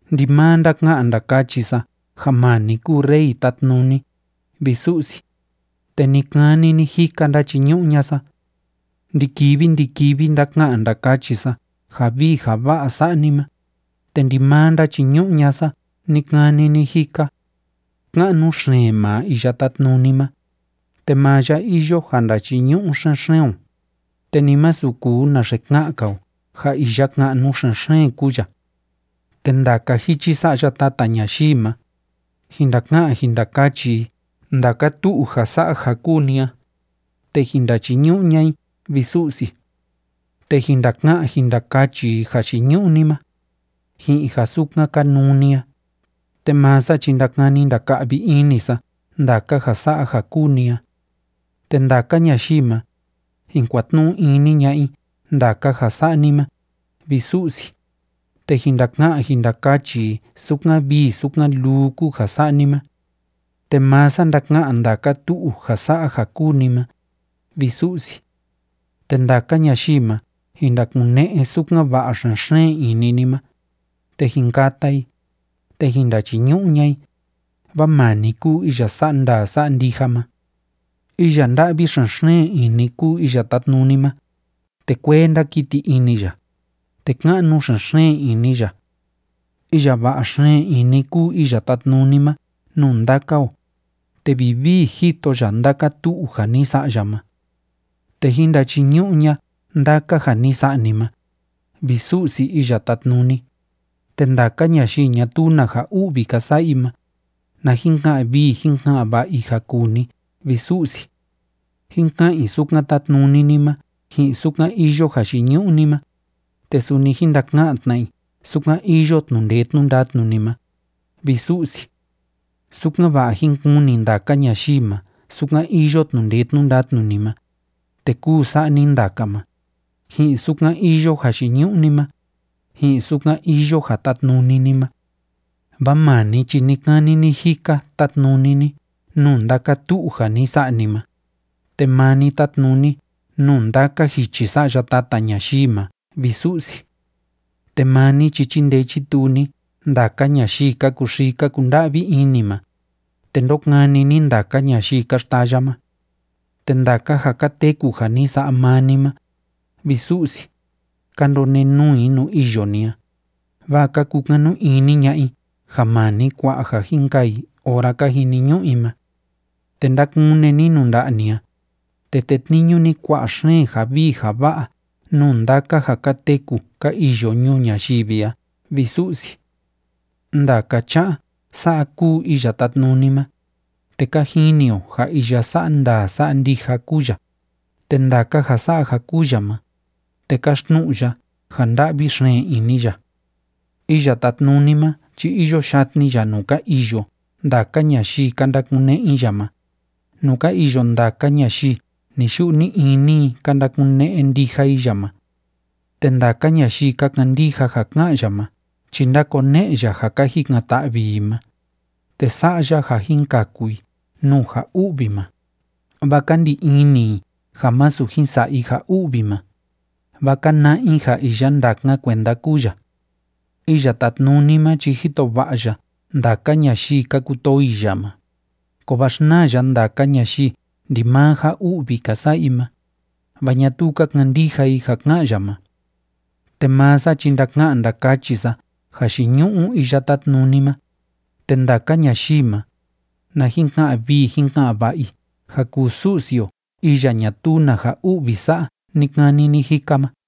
Ndimaa ndaka'an ndakachi sa ja maa ni kúu Rey tátnuni, vi Su'si, te ni‑kani ni‑jika ndachiñu'u ña'a sa. Ndi‑kivi ndi‑kivi ndaka'an ndakachi sa ja vii ja va'a sa'a ni ma, te ndimaa ndachiñu'u ña'a sa ni‑kani ni‑jika. Ka'nu xeen maa Iya Tátnuni ma, te maa ya iyo ja ndachiñu'u xen‑xeen o, te ni masu kuu naxe ka'an‑nka o ja iya ka'nu xen‑xeen kúu ya. Te ndaka jichi sa'ya tata ñayii ma, jin ndaka'an jin ndakachi i ndaka tu'u ja sa'a ja kúu ni a, te jin ndachiñu'u ña'a i, vi Su'si. Te jin ndaka'an jin ndakachi i jayiñu'u ni ma, ji'in ja sukan kanuu ni a. Te maa sa chi ndakani ndaka'vi ini sa ndaka ja sa'a ja kúu ni a. Te ndaka ñayii ma, jin kuatnu'u ini ña'a i ndaka ja sa'a ni ma, vi Su'si, te jin ndaka'an jin ndakachi i sukan vii sukan luu kúu ja sa'a ni ma. Te maa sa ndaka'an ndaka tu'u ja sa'a ja kúu ni ma, vi Su'si. Te ndaka ñayii ma jin ndakune'e sukan va'a xen‑xeen ini ni ma, te jin kata i, te jin ndachiñu'u ña'a i, vaa maa ni kúu iya sa'a ndaa sa'a ndija ma. Iya nda'vi xen‑xeen ini kúu Iya Tátnuni ma, te kuee ndákiti ini ya, te ka'nu xen‑xeen ini ya. Iya va'a xeen ini kúu Iya Tátnuni ma nuu ndaka o, te vivii jito ya ndaka tu'u ja ni sa'a ya ma. Te jín ndachiñu'u ña'a ndaka ja ni sa'a ni ma, vi Su'si Iya Tátnuni, te ndaka ñayii ñatuu na ja u'vi ka sa'a i ma, na jin ka'an vii jín ka'an va'a i ja kuu ni, vi Su'si. Jín ka'an i sukan tátnuni ni ma ji'in sukan iyo jayiñu'u ni ma, te suni jín ndaka'an tna i sukan iyo tnu'u ndee tnu'u ndatnu ni ma, vi Su'si. Sukan‑va'a jín kuni ndaka ñayii ma sukan iyo tnu'u ndee tnu'u ndatnu ni ma, te kúu sa'a ni ndaka ma, ji'in sukan iyo jayiñu'u ni ma, ji'in sukan iyo ja tátnuni ni ma. Vaa maa ni chi ni‑kani ni‑jika tátnuni ni nuu ndaka tu'u ja ni sa'a ni ma, te maa ni tátnuni nuu ndaka jichi sa'ya tata ñayii ma, vi Su'si. Te maa ni chi chíndee chítuu ni ndaka ñayii ka kuxii ka kunda'vi ini ma, te ndókani ni ndaka ñayii ka xtaya ma. Te ndaka ja ka teku ja ni sa'a maa ni ma, vi Su'si, ka ndonenuu i nuu iyo ni a, vaa ka kukanu ini ña'a i ja maa ni kua'a ja jin kaa i ora ka jiniñu'u i ma. Te ndákune ni nuu nda'a ni a, te tétniñu ni kua'a xeen ja vii ja va'a nuu ndaka ja ka teku ka iyo ñuu ñayivi a, vi Su'si. Ndaka cha'a sa'a kúu Iya Tátnuni ma, te ka jini o ja iya sa'a ndaa sa'a ndija kúu ya, te ndaka ja sa'a ja kúu ya ma, te káxtnu'u ya ja nda'vi xeen ini ya. Iya Tátnuni ma chi iyo yatni ya nuu ka iyo ndaka ñayii ka ndakune'e i ya ma, nuu ka iyo ndaka ñayii ni‑yu'u ni‑ini i ka ndakune'e ndija i ya ma. Te ndaka ñayii ka kandija ja ká'an ya ma chi ndákone'e ya ja ka jikan‑ta'vi i ma, te sa'a ya ja jin kaku i nuu ja u'vi ma, vaa ka ndi ini i ja masu jin sa'a i ja u'vi ma, vaa ka na'a i ja iya ndákan kuenda kúu ya. Iya Tátnuni ma chi jito va'a ya ndaka ñayii ka kutoo i ya ma, kovaa xnaa ya ndaka ñayii ndimaa ja u'vi ka sa'a i ma, vaa ñatuu ka kandija i ja ká'an ya ma. Te maa sa chi ndaka'an ndakachi sa jayiñu'u Iya Tátnuni ma, te ndaka ñayii ma, na jin ka'an vii jín ka'an va'a i ja kuu Su'si o iya ñatuu na ja u'vi sa'a ni‑kani ni‑jika ma.